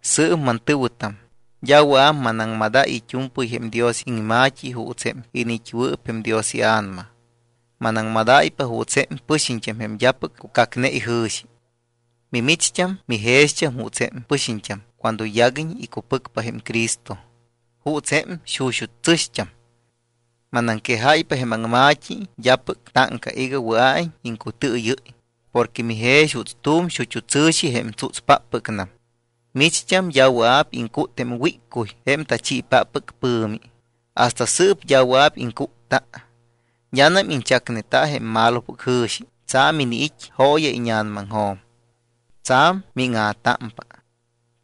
Sɨɨp, mantɨ̱wɨtam, d́a wɨa̱p manaŋmadáy it́u̱mpɨy jém Dios iŋma̱t́i juuts jém iniit́wɨɨp jém Dios iA̱nama. Manaŋmadáypa juuts jém pɨxiñt́am jém d́apɨc cucacne ijɨ̱xi. Mimicht́am mijext́am juuts jém pɨxiñt́am cuando yaguiñ icupɨcpa jém Cristo, juuts jém xuxut́ tsɨ̱xt́am. Manaŋquejáypa jém aŋma̱t́i d́apɨc táŋca iga wɨa̱iñ iŋcutɨɨyɨ́y porque mijex juuts tu̱m xut́u tsɨ̱xi jém tsútspáppɨcnam. Micht́am d́a wɨa̱p iŋcút jém wíccuy jém tachiipáppɨc pɨ̱mi. Hasta sɨɨp d́a wɨa̱p iŋcútta. D́anam iñchacneta jém malopɨc jɨ̱xi, tsa̱m iniit́ jooya íña̱namaŋjo̱m. Tsa̱m míŋa̱támpa.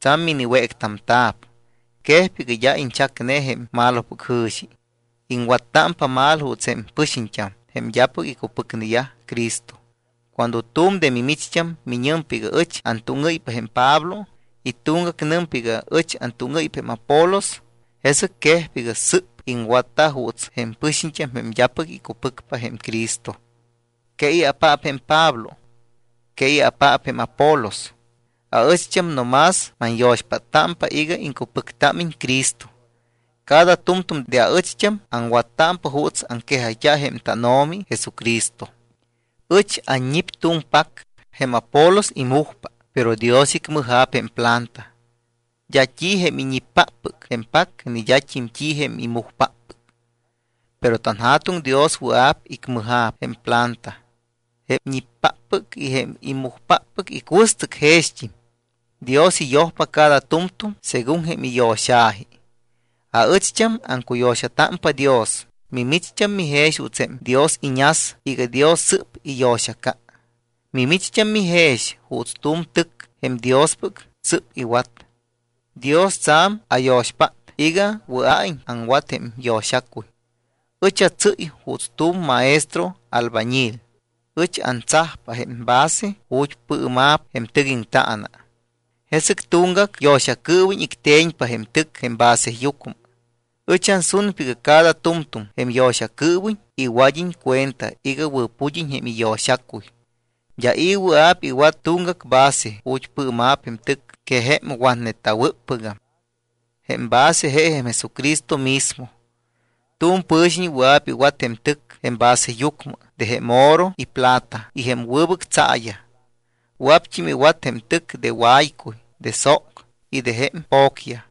Tsa̱m miniwéctamta̱p. Quejpa iga d́a iñchacne jém malopɨc jɨ̱xi. Iŋwattámpa mal juuts jém pɨxiñt́am jém d́apɨc icupɨcneyaj Cristo. Cuando tu̱m de mimicht́am miñɨmpa iga: “Ɨch antúŋɨ́ypa jém Pablo” y tuŋgac nɨmpa iga: “Ɨch antúŋɨ́ypa jém Apolos”, jesɨc quejpa iga sɨ́p iŋwatta juuts jém pɨxiñt́am jém d́apɨc icupɨcpa jém Cristo. ¿Que i̱apaap jém Pablo? ¿Que i̱apaap jém Apolos? Aɨcht́am no más manyo̱xpáttámpa iga iŋcupɨctámiñ Cristo. Cada tu̱m tu̱m de aɨcht́am aŋwattámpa juuts aŋquejayt́a jém tánO̱mi Jesucristo. Ɨch anñip tu̱m pac. Jém Apolos imujpa. Pero Dios icmɨja̱p jém planta. D́a t́i jém iñippáppɨc jém pac ni d́at́im t́i jém imujpáppɨc, pero tanJa̱tuŋ Dios wɨa̱p icmɨja̱p jém planta. Jém ñippáppɨc y jém imujpáppɨc icuɨstɨc jext́im. Dios iyojpa cada tu̱mtu̱m según jém iyo̱xa̱ji. Aɨcht́am aŋcuyo̱xatámpa Dios. Mimicht́am mijex juuts jém Dios iñas iga Dios sɨ́p iyo̱xaca. Micht́am mijex juuts tu̱m tɨc jém Diospɨc sɨ́p iwat. Dios tsa̱m ayo̱xpát iga wɨa̱iñ aŋwat jém yo̱xacuy. Ɨch atsɨ́y juuts tu̱m maestro albañil. Ɨch antsajpa jém base ju̱t́ pɨɨma̱p jém tɨc aŋtaana. Jesɨc tuŋgac yo̱xacɨɨwiñ icte̱ñpa jém tɨc jém baseyucmɨ. Ɨch ansunpa iga cada tu̱mtu̱m jém yo̱xacɨɨwiñ iwad́iñ cuenta iga wɨ̱pud́iñ jém iyo̱xacuy. D́a i̱ wɨa̱p iwat tuŋgac base ju̱t́ pɨɨma̱p jém tɨc que jém watneta̱wɨ́ppɨgam. Jém base je jém Jesucristo mismo. Tu̱m pɨ̱xiñ wɨa̱p iwat jém tɨc jém baseyucmɨ de jém oro y plata y jém wɨbɨc tsaayaj. Wɨa̱pt́im iwat jém tɨc de waycuy, de sóc y de jém po̱cyaj.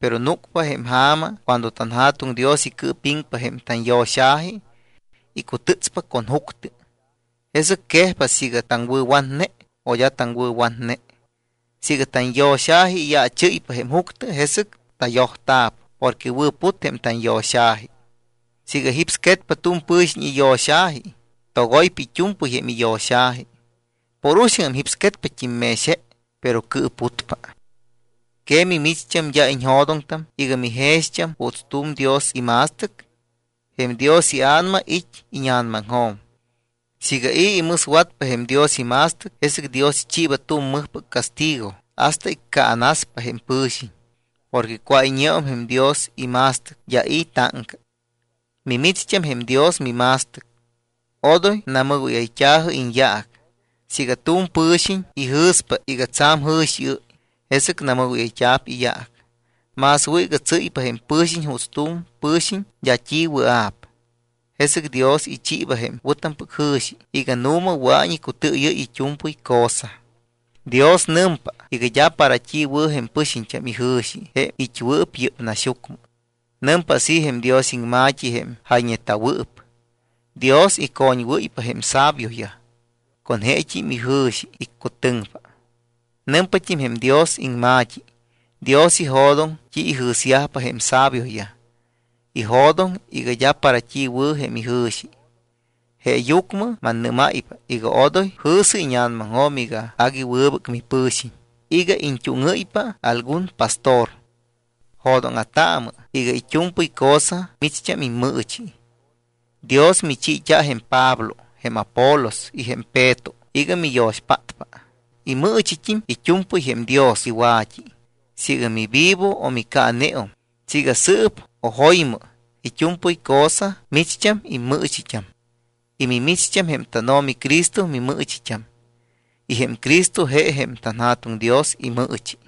Pero núcpa jém ja̱ma cuando tanJa̱tuŋ Dios icɨɨpiŋpa jém tanyo̱xa̱ji. Icutɨtspa con juctɨ, jesɨc quejpa siiga taŋwɨ̱watne o d́a taŋwɨ̱watne. Siiga tanyo̱xa̱ji iyaachɨ́ypa jém juctɨ, jesɨc tayojta̱p porque wɨ̱put jém tanyo̱xa̱ji. Siiga jípsquetpa tu̱m pɨ̱xiñ iyo̱xa̱ji, togoypa it́u̱mpɨy jém iyo̱xa̱ji. Por uxaŋ jípsquetpat́im mex je, pero cɨɨputpa. ¿Que micht́am d́a iñjo̱doŋtam iga mijext́am juuts tu̱m Dios ima̱stɨc? Jém Dios iA̱nama it́ íña̱namaŋjo̱m. Siiga i̱ imɨswatpa jém Dios ima̱stɨc, jesɨc Dios ichiiba tu̱m mɨjpɨc castigo hasta iccaanaspa jém pɨ̱xiñ. Porque cuáyñeum jém Dios ima̱stɨc, d́a i̱ táŋca. Mimicht́am jém Dios mima̱stɨc. Odoy namɨgóyayt́a̱jɨ iñyaac. Siiga tu̱m pɨ̱xiñ ijɨ̱spa iga tsa̱m jɨ̱xiɨ́y, jesɨc namɨgóyayt́a̱p iyaac. Más wɨ̱ iga tsɨ́ypa jém pɨ̱xiñ juuts tu̱m pɨ̱xiñ d́a t́i wɨa̱p, jesɨc Dios ichiiba jém wɨ̱tampɨc jɨ̱xi iga nu̱ma wɨa̱iñ icutɨɨyɨ́y it́u̱mpɨy cosa. Dios nɨmpa iga d́a para t́i wɨ̱ jém pɨxiñt́am ijɨ̱xi jém it́wɨɨp yɨ́p naxyucmɨ. Nɨmpa así jém Dios iŋma̱t́i jém jayñeta̱wɨɨp: “Dios icoñwɨ́ypa jém sabioyaj, con jeet́im ijɨ̱xi iccutɨŋpa.” Nɨmpat́im jém Dios iŋma̱t́i: “Dios ijo̱doŋ t́i ijɨ̱syajpa jém sabioyaj. Ijo̱doŋ iga d́a para t́i wɨ̱ jém ijɨ̱xi.” Jeeyucmɨ mannɨ́máypa iga odoy jɨ̱sɨ íña̱namaŋjo̱m iga agui wɨbɨc mipɨ̱xiñ iga iñt́úŋɨ́ypa algun pastor. Jo̱dóŋa̱taamɨ iga it́u̱mpɨy cosa micht́am immɨɨchi. Dios michiit́a jém Pablo, jém Apolos y jém Peto iga miyo̱xpátpa. Immɨɨchit́im it́u̱mpɨy jém Dios iwa̱t́i. Siiga mivivo o micaaneum, siiga sɨɨp o jo̱ymɨ, it́u̱mpɨy cosa micht́am immɨɨchit́am. Y mimicht́am jém tánO̱mi Cristo mimɨɨchit́am. Y jém Cristo je jém tanJa̱tuŋ Dios imɨɨchi.